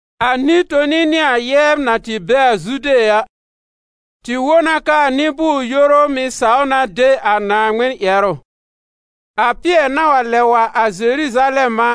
A nɩ-toni nɩ a yɛbr na tɩ be a Zude a, tɩ wõ na k'aa nɩ-bʋʋr-yoru mɩ̀ saw na de a Naaŋmɩn ƴɛrʋ. A Pɩɛr na wa lɛb wa a Zeruzalɛm a,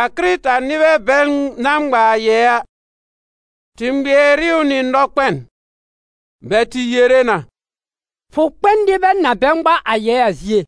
a Kɩrɩta-nɩbɛ bɛl na ŋma a yɛɛ a, tɩ ŋmɩɛr ɩ ʋ nɩ nɔkpɛn. Bɛ tɩ yere na: «Fʋ kpɛ n nɩbɛ na bɛ ŋma a yɛɛ a zie,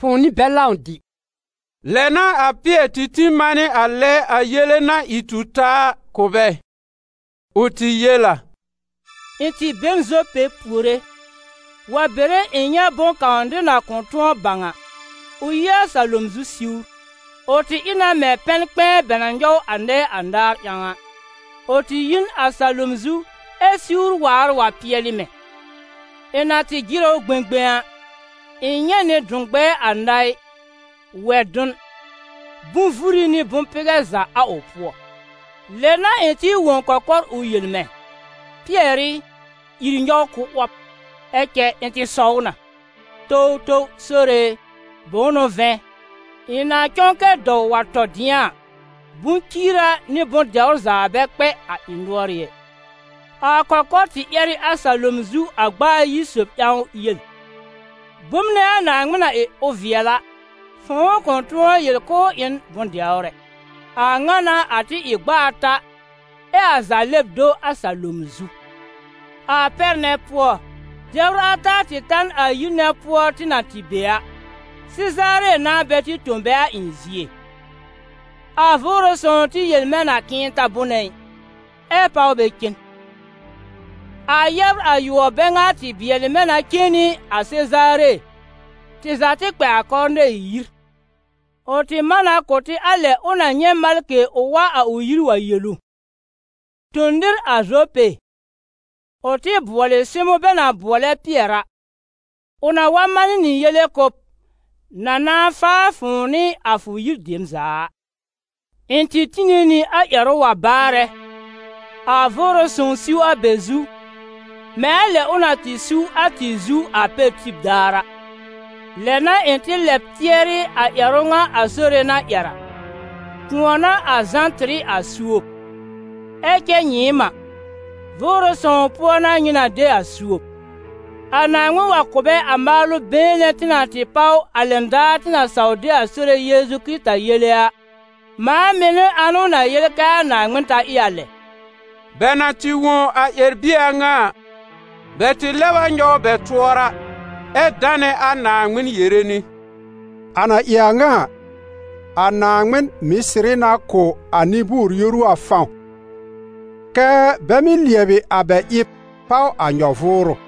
fʋ̃ʋ nɩ bɛl lãw dɩ!» Lɛ n'a a Pɩɛr tɩ tĩ manɩ a lɛ a yele na ɩ tu taa a, kʋ̀ bɛ. Ʋ tɩ yel a: «Ɩ̃ tɩ be n Zope puore, wa bere ɩ̃ nyɛ̃ bʋ̃-kãw nɩr na kʋ̃ tʋ̃ɔ bãw a, ʋ yi a salom zu siwr; ʋ tɩ ɩ na mɛ̃ pɛn-kpɛ̃ɛ bɛ na nyɔw a nɛɛ anaar ƴãw a, ʋ tɩ yi n a salom zu ɛ siwr waar wa pɩɛlɩ mɛ̃. Ɩ̃ na tɩ jɩrɛ ʋ gbẽgbẽ a, ɩ̃ nyɛ̃ nɩ dʋ̃-gbɛɛ anaɩ, wɛ-dʋn, bʋ̃-vuri nɩ bʋ̃-pɩgɛ za a ʋ pʋɔ. Lɛ n'a ɩ̃ tɩ wõ kɔkɔr ʋ yel mɛ̃: ‹Pɩɛr ɩ, ìr nyɔw kʋ́ 'wɔb!› Ɛ cɛ ɩ̃ tɩ sɔw na: ‹Towtow Sore e, bʋ̃ʋ n'ʋ vɛ̃, ɩ̃ na cɔ̃ kɛ dɔw wa tɔ dɩ̃a a, bʋ̃-ciira nɩ bʋ̃-dɛwr za bɛ kpɛ ɩ̃ nʋɔrɩ́ ɛ.› A kɔkɔr tɩ ƴɛr ɩ a salom zu a gb'a ayi sob ƴãw yel: ‹Bom nɛ a Naaŋmɩn na ɩ ʋ vɩɛl a, fʋ̃ʋ kʋ̃ tʋ̃ɔ yel k'ʋʋ ɩ n bʋ̃-dɛwr ɛ.› A ŋa n'a a tɩ ɩ gb'a ata, ɛ a za lɛb do a salom zu. A pɛr nɛ pʋɔ, dɛbr ata tɩ ta n a yir nɛ pʋɔ tɩ na tɩ be a; Sezaare n'a bɛ tɩ tõ bɛ a ɩ̃ zie. A Vʋʋrʋ Sõw tɩ yel mɛ̃ na k'ɩ̃ɩ ta bʋnɛ ɩ, ɛ páw bɛ cen. A yɛbr ayʋɔb bɛ ŋa tɩ bɩɛlɩ mɛ̃ na cen nɩ a Sezaare, tɩ za tɩ kpɛ a Kɔrnɛɩ yir. Ʋ tɩ man na kʋ̀ tɩ a lɛ ʋ na nyɛ̃ malkɩ ʋ wa a ʋ yir wa yel ʋ: ‹Tõ nɩr a Zope, ʋ tɩ bʋɔlɩ Sɩmʋ̃ bɛ na bʋɔlɛ Pɩɛr a. Ʋ na wa manɩ nɩ yele kʋ̀ b, na na faa fʋ̃ʋ nɩ a fʋ yir dem za a.› Ɩ̃ tɩ tine nɩ a ƴɛrʋ wa baarɛ, a Vʋʋrʋ Sõw siw a bɛ zu, mɛ̃ a lɛ ʋ na tɩ siw a tɩ zu a pɛr tib daar a. Lɛ n'a ɩ̃ tɩ lɛb tɩɛrɩ a ƴɛrʋ ŋa a Sore na ƴɛr a: ‹Kʋ̃ɔ n'a a Zã tɩr ɩ a suob, ɛ cɛ nyɩɩm a, Vʋʋrʋ Sõw pʋɔ n'a nyɩ na de a suob.› A Naaŋmɩn wa kʋ̀ bɛ a maalʋ been nɛ tɩ na tɩ páw, a lɛn daar tɩ na saw de a Sore Yeezu Kɩrɩta yele a, mãa mɩ̀ n'ɩ ãnʋ na yel kɛ a Naaŋmɩn ta ɩ a lɛ?» Bɛ na tɩ wõ a ƴɛr-bie a ŋa a, bɛ tɩ lɛb a nyɔw bɛ tʋɔra ɛ danɛ a Naaŋmɩn yere nɩ: «A na ɩ a ŋa a, a Naaŋmɩn mɩ̀ sɩrɩ na kʋ̀ a nɩ-bʋʋr-yoru a fãw kɛ́ bɛ mɩ́ lɩɛbɩ a bɛ ɩb páw a nyɔ-vʋʋrʋ.»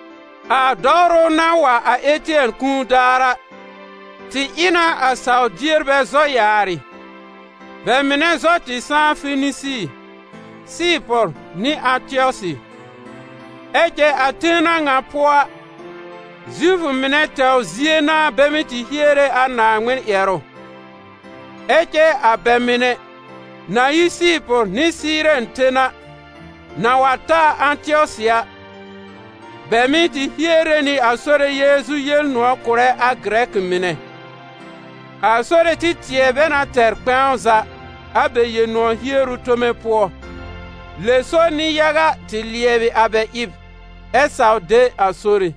A dɔwrʋ na tɩ wa a Ɩtɩɛn kũu daar a, tɩ ɩ na a saw-dierbɛ zɔ yaarɩ, bɛ mɩnɛ zɔ tɩ sãá Fenisi, Sɩɩpʋr nɩ Ãtɩɔsɩ; ɛ cɛ a ten a ŋa pʋɔ a, Zifʋ mɩnɛ tɛwr zie n'a bɛ tɩ hiere a Naaŋmɩn ƴɛrʋ. Ɛ cɛ a bɛ mɩnɛ, na yi Sɩɩpʋr nɩ Sɩɩrɛn ten a, na wa ta a Ãtɩɔsɩ a, bɛ mɩ̀ tɩ hiere nɩ a Sore Yeezu Yel-nʋ̃ɔ̀ kʋ̀rɛ a Gɩrɛkɩ mɩnɛ. A Sore tɩ tɩɛ bɛ na tɛr kpɛ̃w za a bɛ Yel-nʋ̃ɔ̀ hieru tome pʋɔ, lɛ so nɩ-yaga tɩ lɩɛbɩ a bɛ ɩb ɛ saw de a Sore.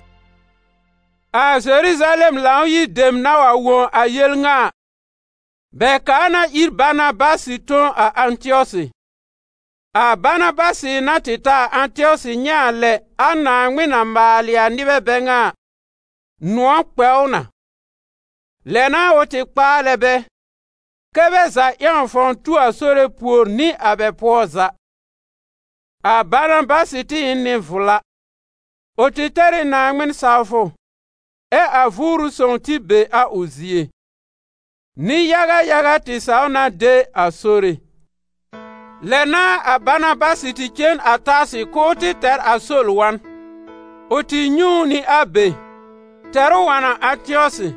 A Zeruzalɛm Lãw-yir dem na wa wõ a yel ŋa a, bɛ kaa na ir Banabasɩ tõ a Ãtɩɔsɩ. A Banabasɩ na tɩ ta a Ãtɩɔsɩ nyɛ̃ a lɛ a Naaŋmɩn na maalɩ a nɩbɛ bɛ ŋa a, nʋ̃ɔ̀ kpɛ ʋ na. Lɛ n'a ʋ tɩ kpaalɛ bɛ, kɛ́ bɛ za ƴãw fãw tu a Sore pùor nɩ a bɛ pʋɔ za. A Banabasɩ tɩ ɩ n nɩ-vla, ʋ tɩ tɛr ɩ Naaŋmɩn sawfʋ, ɛ a Vʋʋrʋ Sõw tɩ be a ʋ zie. Nɩ-yaga yaga tɩ saw na de a Sore. Lɛ n'a a Banabasɩ tɩ cen a Tarsɩ k'ʋʋ tɩ tɛr a Sol wa n. Ʋ tɩ nyɛ̃ ʋ nɩ a be, tɛr ʋ wa n a Ãtɩɔsɩ,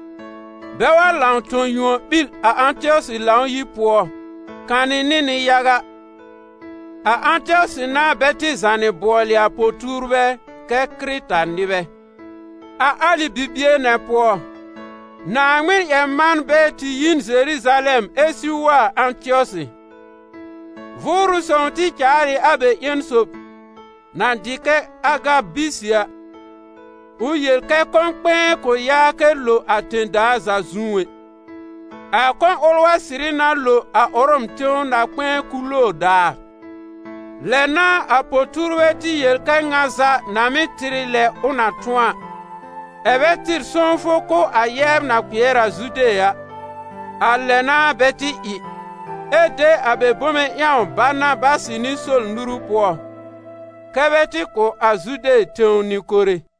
bɛ wa lãw tõ yuon ɓil a Ãtɩɔsɩ Lãw-yir pʋɔ kanɩ nɩ nɩ-yaga. A Ãtɩɔsɩ n'a bɛ tɩ zànɩ bʋɔlɩ a po-tuurbɛ kɛ Kɩrɩta-nɩbɛ. A alɩ bibie nɛ pʋɔ, Naaŋmɩn-ƴɛr-manbɛ tɩ yi n Zeruzalɛm ɛ siw wa a Ãtɩɔsɩ. Vʋʋrʋ Sõw tɩ caal ɩ a bɛ ƴẽn sob, na dɩ kɛ Agabisɩ a, ʋ yel kɛ kɔ̃-kpɛ̃ɛ kʋ̃ yaa kɛ lo a tẽ-daa za zu ɛ. A kɔ̃ ʋl wa sɩrɩ na lo a Ʋrɔm tẽw na-kpɛ̃ɛ Kuloor daar. Lɛ n'a a po-tuurbɛ tɩ yel kɛ ŋa za na mɩ́ tɩr ɩ lɛ ʋ na tʋ̃ɔ a, ɛ̀ bɛ tɩr sõwfʋ kʋ̀ a yɛbr na kpɩɛr a Zude a. A lɛ n'a bɛ tɩ ɩ, ɛ de a bɛ bome ƴãw Banabasɩ nɩ Sol nuru pʋɔ, kɛ́ bɛ tɩ kʋ̀ a Zude tẽw nɩ-kore.